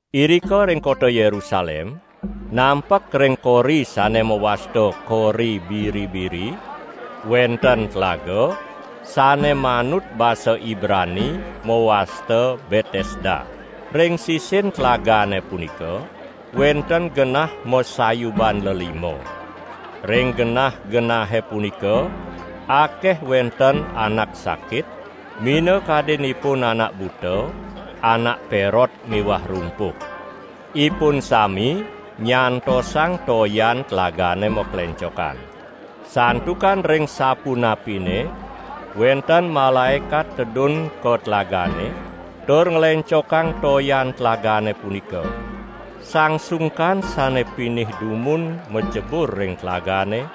Irika ring kota Yerusalem, nampek ring kori sane mawasta Kori Biri-biri, wenten tlaga, sane manut basa Ibrani mawasta Betesda. Ring sisin tlagane punika wenten genah masayuban lelima. Ring genah-genahe punika akeh wenten anak sakit, minakadinipun anak buta, anak perot miwah rumpuh. Ipun sami nyantosang toyan tlagane maklencokan. Santukan ring sapunapine wenten malaekat tedun ka tlagane, tur nglencokang toyan tlagane punika. Sang sungkan sane pinih dumun macebur ring tlagane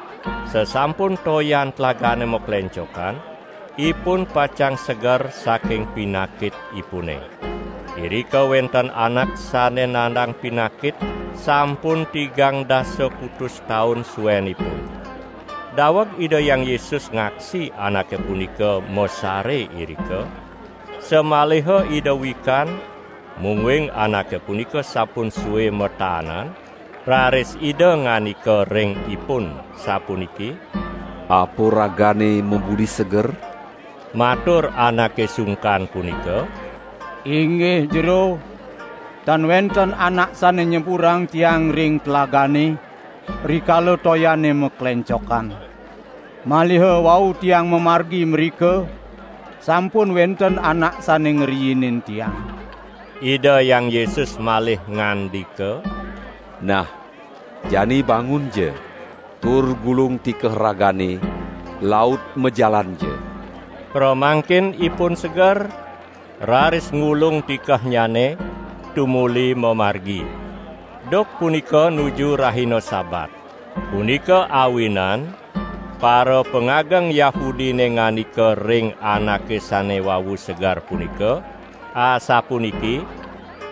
sasampun toyan tlagane maklencokan, ipun pacang seger saking pinakitipune. Irika wenten anak sane nandang pinakit sampun tigang dasa kutus taun suenipun. Daweg Ida Hyang Yesus ngaksi anake punika masare irika, samaliha Ida wikan mungguing anake punika sampun sue mataanan, raris Ida ngandika ring ipun sapuniki: "Apa ragane mabudi seger?" Matur anake sungkan punika: "Inggih Jero, tan wenten anak sane nyeburang tiang ring tlagane, rikala toyane maklencokan. Maliha wau tiang mamargi mrika, sampun wenten anak sane ngriinin tiang." Ida Hyang Yesus malih ngandika: "Nah, jani bangunja tur gulung tikeh ragane laut majalanja!" Pramangkin ipun seger, raris ngulung tikehnyane, tumuli mamargi. Duk punika nuju rahina Sabat. Punika awinan parapangageng Yahudine ngandika ring anake sane wau seger punika asapuniki: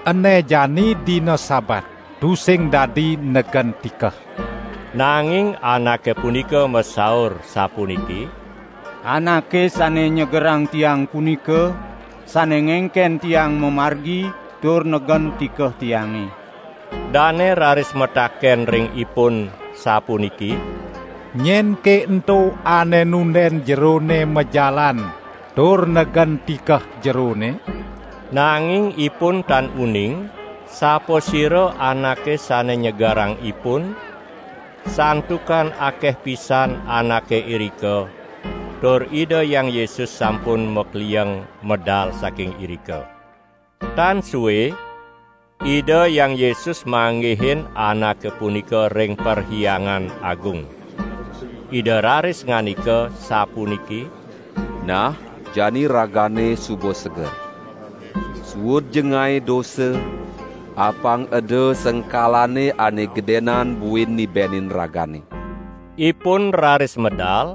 "Ene jani dina Sabat, tusing dadi negen tikeh!" Nanging anake punika masaur sapuniki: "Anake sane nyegerang tiang punika, sane ngengken tiang mamargi tur negen tikeh tiange." Dane raris mataken ring ipun sapuniki: "Nyenke ento ane nunden jerone majalan tur negen tikeh jerone?" Nanging ipun tan uning sapasira anake sane nyegerang ipun santukan akeh pisan anake irika tur Ida Hyang Yesus sampun maklieng medal saking irika. Tan sue, Ida Hyang Yesus manggihin anake punika ring Perhyangan Agung. Ida raris ngandika sapuniki: "Nah, jani ragane suba seger. Suudja ngae dosa, apang eda sengkalane ane gedenan buin nibenin ragane!" Ipun raris medal,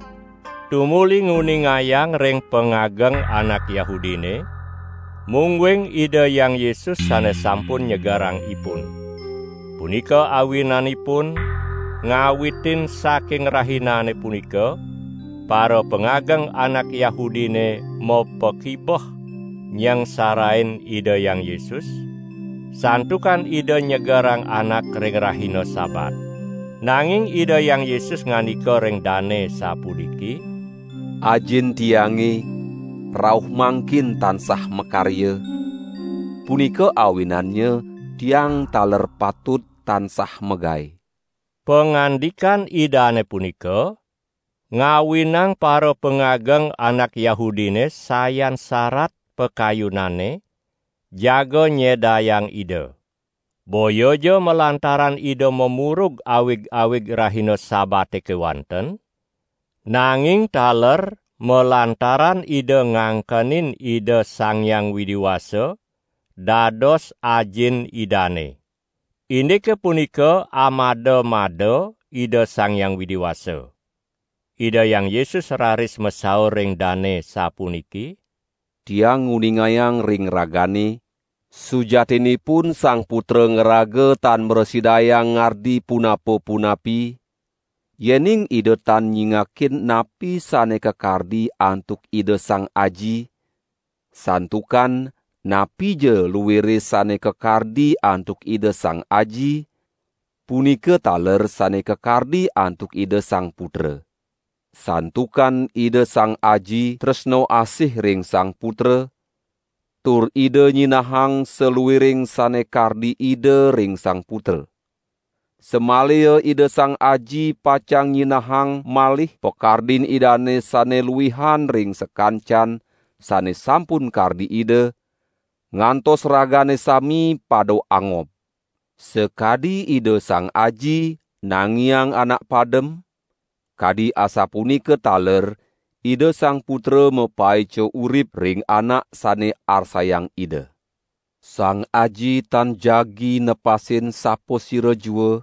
tumuli nguningayang ring pangageng anak Yahudine, mungguing Ida Hyang Yesus sane sampun nyegerang ipun. Punika awinanipun ngawitin saking rahinane punika parapangageng anak Yahudine mapakibeh nyangsarain Ida Hyang Yesus, santukan Ida nyegerang anak ring rahina Sabat. Nanging Ida Hyang Yesus ngandika ring dane sapuniki: "Ajin Tiange rauh mangkin tansah makarya, punika awinannya Tiang taler patut tansah magae!" Pangandikan Idane punika ngawinang parapangageng anak Yahudine sayan sarat pakayunanne jaga nyedayang Ida. Boyaja lantaran Ida mamurug awig-awig rahina Sabate kewanten, nanging taler malantaran Ida ngangkenin Ida Sang Hyang Widi Wasa dados Ajin Idane. Indike punika amada-mada Ida Sang Hyang Widi Wasa. Ida Hyang Yesus raris masaur ring dane sapuniki: "Tiang nguningayang ring ragane, sujatinipun Sang Putra ngraga tan mrasidayang ngardi punapa-punapi, yening Ida tan nyingakin napi sane kakardi antuk Ida Sang Aji, santukan napija luire sane kakardi antuk Ida Sang Aji, punika taler sane kakardi antuk Ida Sang Putra. Santukan Ida Sang Aji tresna asih ring Sang Putra tur Ida nyinahang saluiring sane kardi Ida ring Sang Putra. Samaliha Ida Sang Aji pacang nyinahang malih pakardin Idane sane luihan ring sakancan sane sampun kardi Ida, ngantos ragane sami pada angob. Sakadi Ida Sang Aji nangiang anak padem, kadi asapunika taler Ida Sang Putra mapaica urip ring anak sane arsayang Ida. Sang Aji tan jagi nepasin sapasira jua,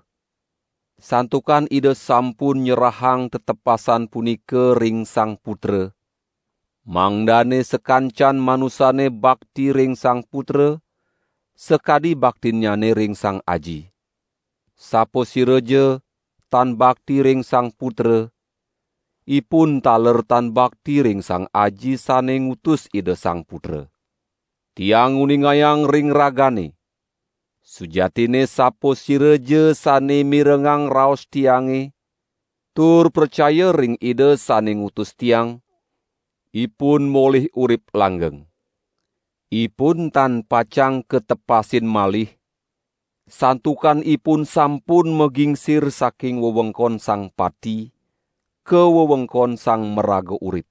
santukan Ida sampun nyerahang tetepasan punika ring Sang Putra, mangdane sakancan manusane bakti ring Sang Putra sakadi baktinnyane ring Sang Aji. Sapasiraja tan bakti ring Sang Putra, ipun taler tan bakti ring Sang Aji sane ngutus Ida Sang Putra. Tiang nguningayang ring ragane: Sujatinne sapasiraja sane mirengang raos Tiange tur pracaya ring Ida sane ngutus Tiang, ipun molih urip langgeng. Ipun tan pacang katepasin malih, santukan ipun sampun magingsir saking wewengkon Sang Pati ka wewengkon Sang Maraga Urip.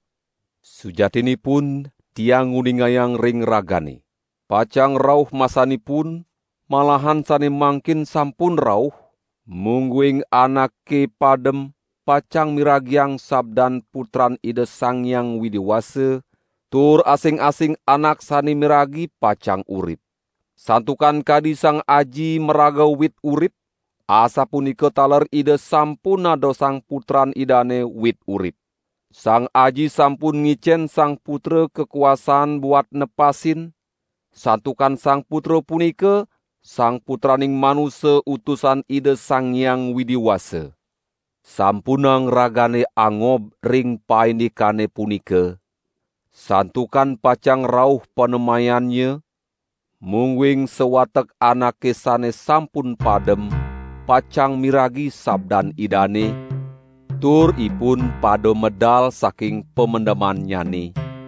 Sujatinipun Tiang nguningayang ring ragane: Pacang rauh masanipun, malahan sane mangkin sampun rauh, mungguing anake padem pacang miragiang sabdan Putran Ida Sang Hyang Widi Wasa, tur asing-asing anak sane miragi pacang urip. Santukan kadi Sang Aji maraga wit urip asapunika taler Ida sampun nadosang Putran Idane wit urip. Sang Aji sampun ngicen Sang Putra kakuasaan buat nepasin, santukan Sang Putra punika Sang Putraning Manusa Utusan Ida Sang Hyang Widi Wasa. Sampunang ragane angob ring paindikane punika, santukan pacang rauh panemayannya, mungguing sawatek anake sane sampun padem pacang miragi sabdan Idane, tur ipun pada medal saking pamendemannyane;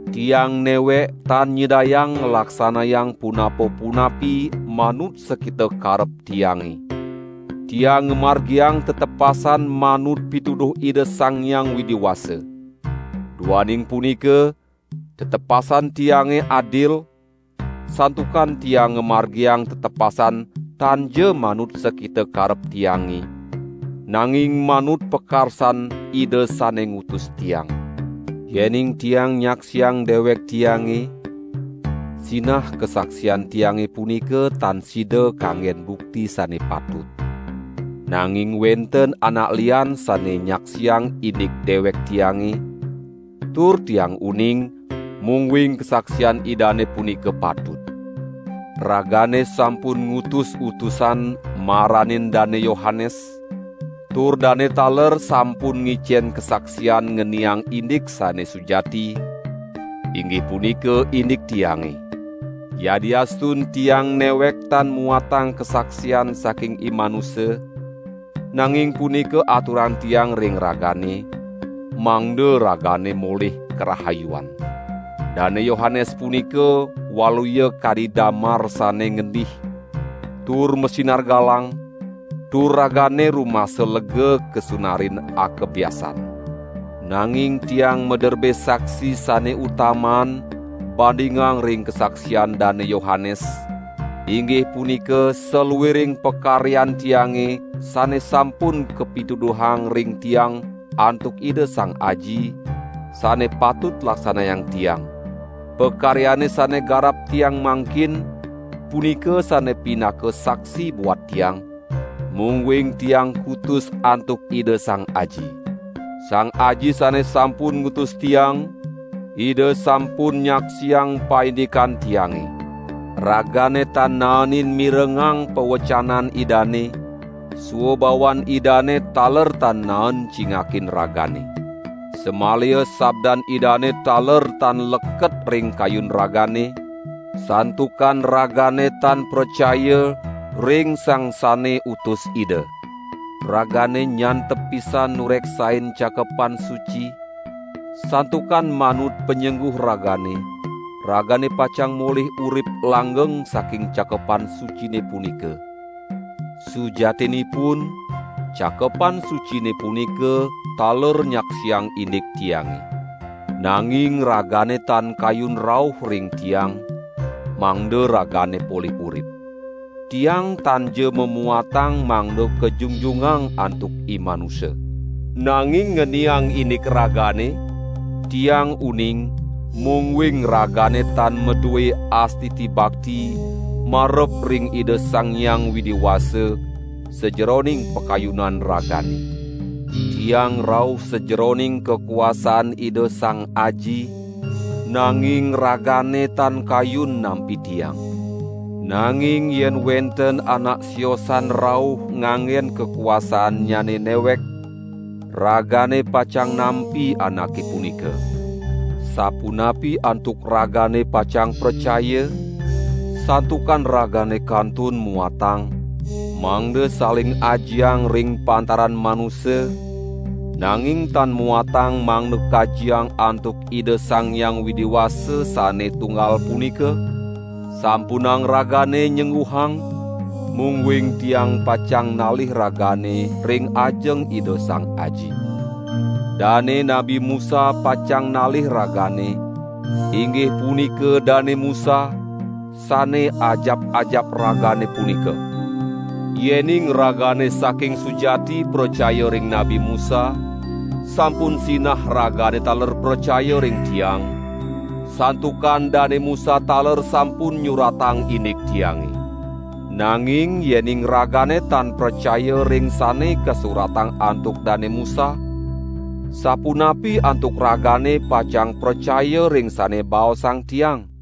"Tiang newek tan nyidayang nglaksanayang punapa-punapi manut sakita karep Tiange; Tiang ngamargiang tetepasan manut pituduh Ida Sang Hyang Widi Wasa. Duaning punika tetepasan Tiange adil, santukan Tiang ngamargiang tetepasan tanja manut sakita karep Tiange, nanging manut pakarsan Ida sane ngutus Tiang. Yening Tiang nyaksiang dewek Tiange, sinah kasaksian Tiange punika tan sida kanggen bukti sane patut. Nanging wenten anak lian sane nyaksiang indik dewek Tiange, tur Tiang uning, mungguing kasaksian Idane punika patut. Ragane sampun ngutus utusan maranin Dane Yohanes, tur dane taler sampun ngicen kasaksian ngeniang indik sane sujati, inggih punika indik Tiange. Yadiastun Tiang newek tan muatang kasaksian saking imanusa, nanging punika aturang Tiang ring ragane, mangda ragane molih karahayuan. Dane Yohanes punika waluya kadi damar sane ngendih tur masinar galang, tur ragane rumasa lega kasunarin akebyasan. Nanging Tiang maderbe saksi sane utamaan bandingang ring kasaksian Dane Yohanes, inggih punika saluiring pakaryan Tiange sane sampun kapituduhang ring Tiang antuk Ida Sang Aji, sane patut laksanayang Tiang. Pakaryane sane garap Tiang mangkin, punika sane pinaka saksi buat Tiang, mungguing Tiang kutus antuk Ida Sang Aji. Sang Aji sane sampun ngutus Tiang, Ida sampun nyaksiang paindikan Tiange. Ragane tan naenin mirengang pawecanan Idane, swabawan Idane taler tan naen cingakin ragane. Samaliha sabdan Idane taler tan leket ring kayun ragane, santukan ragane tan pracaya ring Sang sane utus Ida. Ragane nyantep pisan nureksain Cakepan Suci, santukan manut panyengguh ragane, ragane pacang molih urip langgeng saking Cakepan Sucine punika. Sujatinipun, Cakepan Sucine punika taler nyaksiang indik Tiange. Nanging ragane tan kayun rauh ring Tiang, mangda ragane polih urip. Tiang tanja mamuatang mangda kajungjungang antuk imanusa. Nanging ngeniang indik ragane, Tiang uning mungguing ragane tan madue astiti bakti marep ring Ida Sang Hyang Widi Wasa sajeroning pakayunan ragane. Tiang rauh sajeroning kakuasaan Ida Sang Aji, nanging ragane tan kayun nampi Tiang. Nanging yen wenten anak siosan rauh nganggen kakuasaannyane newek, ragane pacang nampi anake punika. Sapunapi antuk ragane pacang pracaya, santukan ragane kantun muatang, mangda saling ajiang ring pantaran manusa, nanging tan muatang mangda kajiang antuk Ida Sang Hyang Widi Wasa sane Tunggal punika? Sampunang ragane nyengguhang, mungguing Tiang pacang nalih ragane ring ajeng Ida Sang Aji. Dane Nabi Musa pacang nalih ragane, inggih punika Dane Musa, sane ajap-ajap ragane punika. Yening ragane saking sujati pracaya ring Nabi Musa, sampun sinah ragane taler pracaya ring Tiang, santukan Dane Musa taler sampun nyuratang indik Tiange. Nanging yening ragane tan pracaya ring sane kasuratang antuk Dane Musa, sapunapi antuk ragane pacang pracaya ring sane baosang Tiang?"